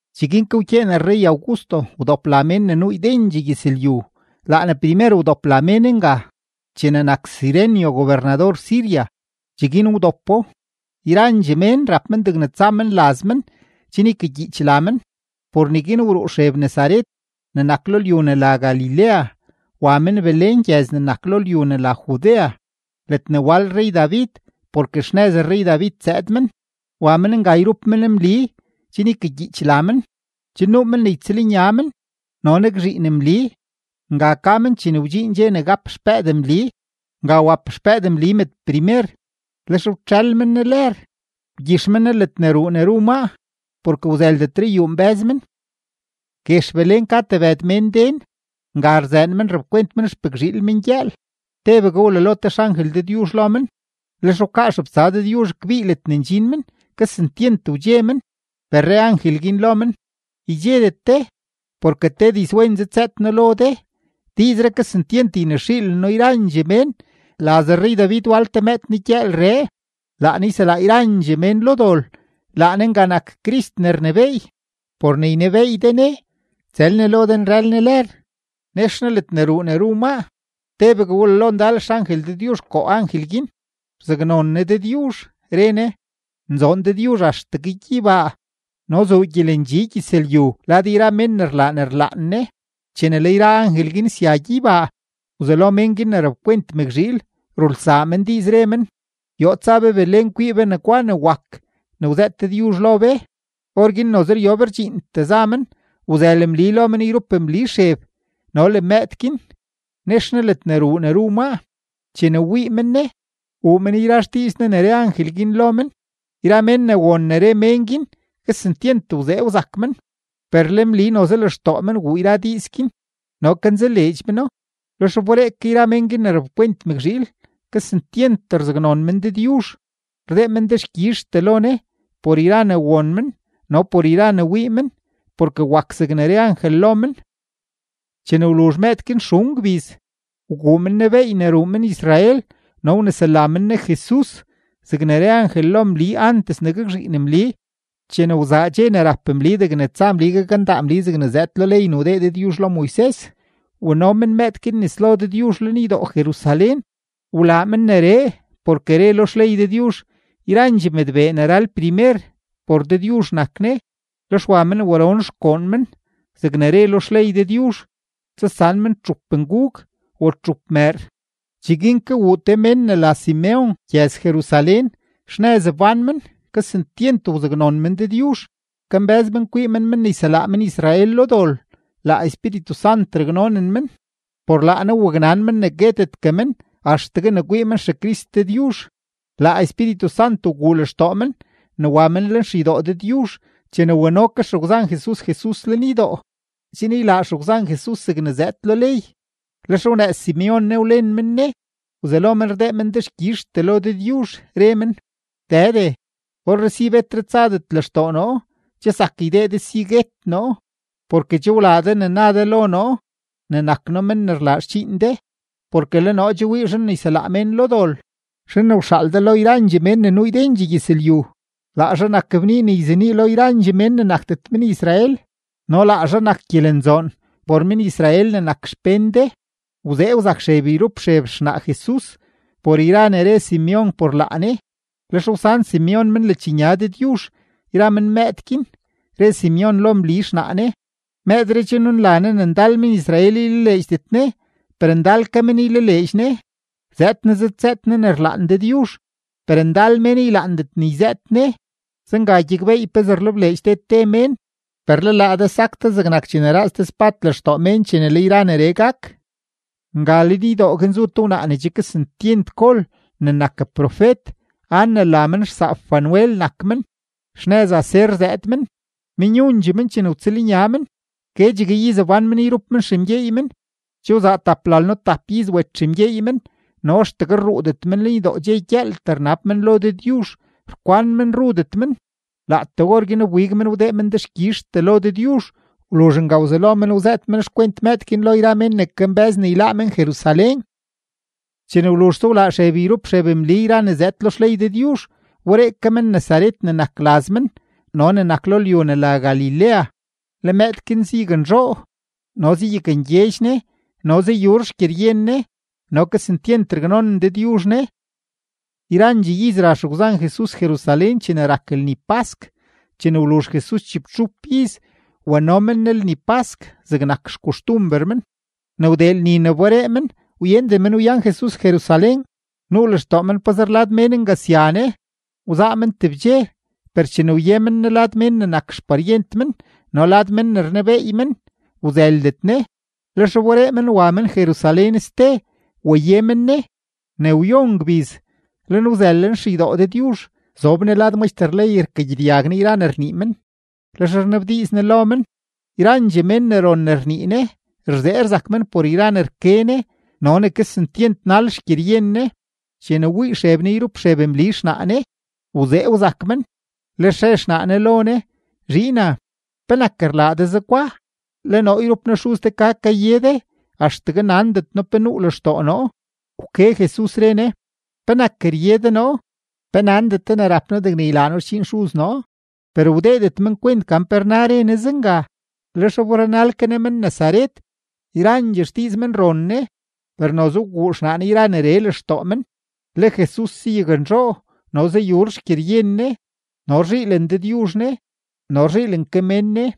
Cheguin ke wkyeen rrey-Augusto wdop la mén ne nuu ydendxee gyëzlyu. Laa ne primer wdop la mén nga, chene nak Cirenio gobernador Siria, cheguin wdopo. Yrandxee mén rap men degne tsa men laz men chen ykagyiich la men. Por neguin wruu Xeb Nazaret ne nak lo lyu ne la Galilea, wa men Belén gyëz ne nak lo lyu ne la Judea ledne wal rrey-David, porke xnëz rrey-David zëëd men. Wa men nga yrup men Mli chen ykagyiich la men; che nuu men ne ytsëlnya men no nakzhiin Mli. Nga ka men chene wdxiin dxe ne gap xpëëd Mli. Nga wap xpëëd Mli mëdprimer, lex wtxël men ne lër, wgyix men ne ledne ruu ne ru maa, porke wzëldetre yuu nbë́z men. Guex Belén ka tebëd mén den; nga rzëën men rapkwent xpëkzhiil men gyëël. Tebegue wlalo te xangel Dëdyuzh lo men, lex wkaa xebtsa Dëdyuzh kbii ledne ndxin men; kesentyent wdxe men. Per re angel guin lo men: ―Ydxedet de, porke te dizwen zëdzëët noo lo de, diizree kesentyent ynexiileno yrandxee mén. Laz rrey-David wal te mëëd negyëëlree; laa ne yselaa yrandxee mén lo dol; laa ne nga nak CRIST ne rnebééy. Por ne ynebeey de ne: Tsël ne lo de nrël ne lër, nex ne ledne ruu ne ru maa. Tebegue wlalo ndal xangel Dëdyuzh koo angel guin; rzaknon ne Dëdyuzh, re ne: ¡Nzoon Dëdyuzh axtegue gyeybaa, no zuu gyelendxi gyëzlyu lad yra mén ne rlaa ne rlaan Ne! Chene le yra angel guin sya gyeybaa, wzelo mén guin ne rapkwent mëkzhiil rulsaa men diiz, re men: ―Yoo tsa be Belén kwii be negwa ne wak ne wzëët Dëdyuzh lo be. Orguin noze ryob rdxiintee za men, wzël Mli lo men yrup Mli Xeb no le mëëd guin, nex ne ledne ruu ne ru maa. Chene wii men ne, wuu men yra xdiiz ne ne re angel guin lo men. Yra mén ne won ne re mén guin, kesentyent wzee wzak men. Per le Mli noze lextoo men wuu yra diiz guin no kanzaleedx meno. Lex wberee ke yra mén guin ne rapkwent mëkzhiil, kesentyent rzaknzoon men Dëdyuzh, rdee men dexkyizhtee lo Ne por yra ne won men no por yra ne wii men, porke wak zegne re angel lo men. Chene wluzh mëëd guin xun gbiz, wguu men ne beey ne ruu men-Israel no wnesela men ne JESUS zegne re angel lo Mli antes ne gakzhiin Mli. Chene wzaa dxe ne rap Mli degne tsa Mli gakndaa Mli zegne zëëd lo ley ne wdee Dëdyuzh lo Moises, wano men mëëd guin nes lo Dëdyuzh lenydo-Jerusalén. Wlaa men neree, porke re lo xley Dëdyuzh: “Yrandxee mëdbee ne ral primer, por Dëdyuzh nak ne.” Lex wa men waron xgoon men zegne re lo xley Dëdyuzh: tsasan men txup ngug o txup mëër. Cheguin ke wuu te mén ne la Simeon gyëz-Jerusalén. Xnëz wbán men, kesentyent wzaknon men Dëdyuzh; kambë́z men kwii men men ne yselaa men-Israel lo dol. Laa Espíritu Sant raknonen men, por laa Ne waknan men ne guetetgue men axtegue ne kwii men XeCrist Dëdyuzh. Laa Espíritu Sant wguu lextoo men ne wa men lenxeydoo Dëdyuzh chene wano ke xegwzan Jesus Jesus lenydoo chen ylaa xegwzan Jesus zegne zëëd lo ley. Lex wnëëz Simeon ne, wlen men ne, wzelo men rdee men dexkyizhtee lo Dëdyuzh, re men: Dëde, orree si betre tsadet lextoo noo, che zak ydee de si guet noo, porke che wlaa de ne na de lo noo ne nak noo men ne rlaa xdxiin de. Porke le noo che wii zhan ne yselaa mén lo dol, zhan ne wxaal de lo yrandxee mén ne nuu ydendxee gyëzlyu. Laa zhaa nak bnii ne yzenii lo yrandxee mén ne nakdet men-Israel, no laa zhaa nak gyelenzoon por men-Israel ne nak xpén de. Wzee wzak Xeb yrup Xeb xnaa Jesus por yra ne re Simeon por laa ne. Lex wsan Simeon men ledxnya Dëdyuzh yra men mëëd guin, re Simeon lo Mli xnaa ne: ―Mëëdree che nunla ne ne ndal men-Israel ylaleedxdet ne, per ndal ke men ylaleedx ne. Zëëd ne zëdzëët ne ne rlaan Dëdyuzh, per ndal mén ylaandet ne yzëët ne. Zenga gyakbeey pezee rlebleedx te te mén. Per le laa de sak de zegnak chene raaz te spad lextoo mén chene le yra neree gak. Nga lenydoo guin zu te wnaa ne che kesentyent gol ne nak profet. Ana la men, xsaap Fanuel nak men, xnëz Aser zëëd men. Menyundxee men chene wtsëlnya men; guedxegue iz wbán men yrup men xemgyeey men. Che wzaa taplalno-tap iz wet xemgyeey men, no axtegue rruudet men lenydoo, dxe gyëëltee rnab men lo Dëdyuzh, rkwan men rudet men. Laatee orguin wbig men wdee men dexkyizhtee lo Dëdyuzh. Wluzh nga wzelo men wzëët men xkwent mëëd guin lo yra mén ne kambë́z ne yláá men-Jerusalén. Chene wluzhse wlaa Xeb yrup Xeb Mli yra ne zëëd lo xley Dëdyuzh, wberee ke men Nazaret ne nak laz men no ne nak lo lyu ne la Galilea. Le mëëd guin zayaknzhoo no zayakngyedx ne no zayur xgyeryen ne, no kesentyent raknonen Dëdyuzh ne. Yrandxee iz ra xegwzan Jesus Jerusalén chene rak lni pask. Chene wluzh Jesus chibtxup iz, wano men Ne lni pask zegnak xkoxtumber men. Ne wdee lni ne wberee men, wyenden men wyan Jesus Jerusalén. Nuu lextoo men pazer lad mén nga sya Ne, wzaa men tebdxe, per chene wye men Ne lad men ne nak xparyent men no lad men ne rnebeey men, wzëldet Ne. Lex wberee men wa men Jerusalén ste waye men Ne. Ne wyon gbiz, le Ne wzël lenxeydoo Dëdyuzh; zob Ne lad maxter ley rkagyedyag Ne yra ne rnii men, lex rnabdiiz Ne lo men. Yrandxee mén ne ron ne rnii Ne, rzee rzak men por yra ne rke Ne no ne kesentyent nal xgyeryen Ne. Chene wii Xeb Ne yrup Xeb Mli xnaa Ne, wzee wzak men, lex re xnaa Ne lo Ne: ―Zhiina, ¿penak rlaa de zegwa? Le noo yrup noo xuz de ka kaye de, axtegue nandet noo pe nuu lextoo noo. Wke Jesus, re Ne: ―¿Penak rye de noo? ¿Pe nandet de ne rap noo degne ylaa noo xdxiin Xuz noo? Per wdeedet men kwent gan pe rna ne re Ne zenga. Lex wberenal ke Ne men Nazaret. Yrandxee xdiiz men ron Ne. Per noze wguu xnaa Ne yra neree lextoo men. Le Jesus zayaknzhoo no zayur xgyeryen Ne, no rzhiilen Dëdyuzh Ne no rzhiilen ke mén Ne.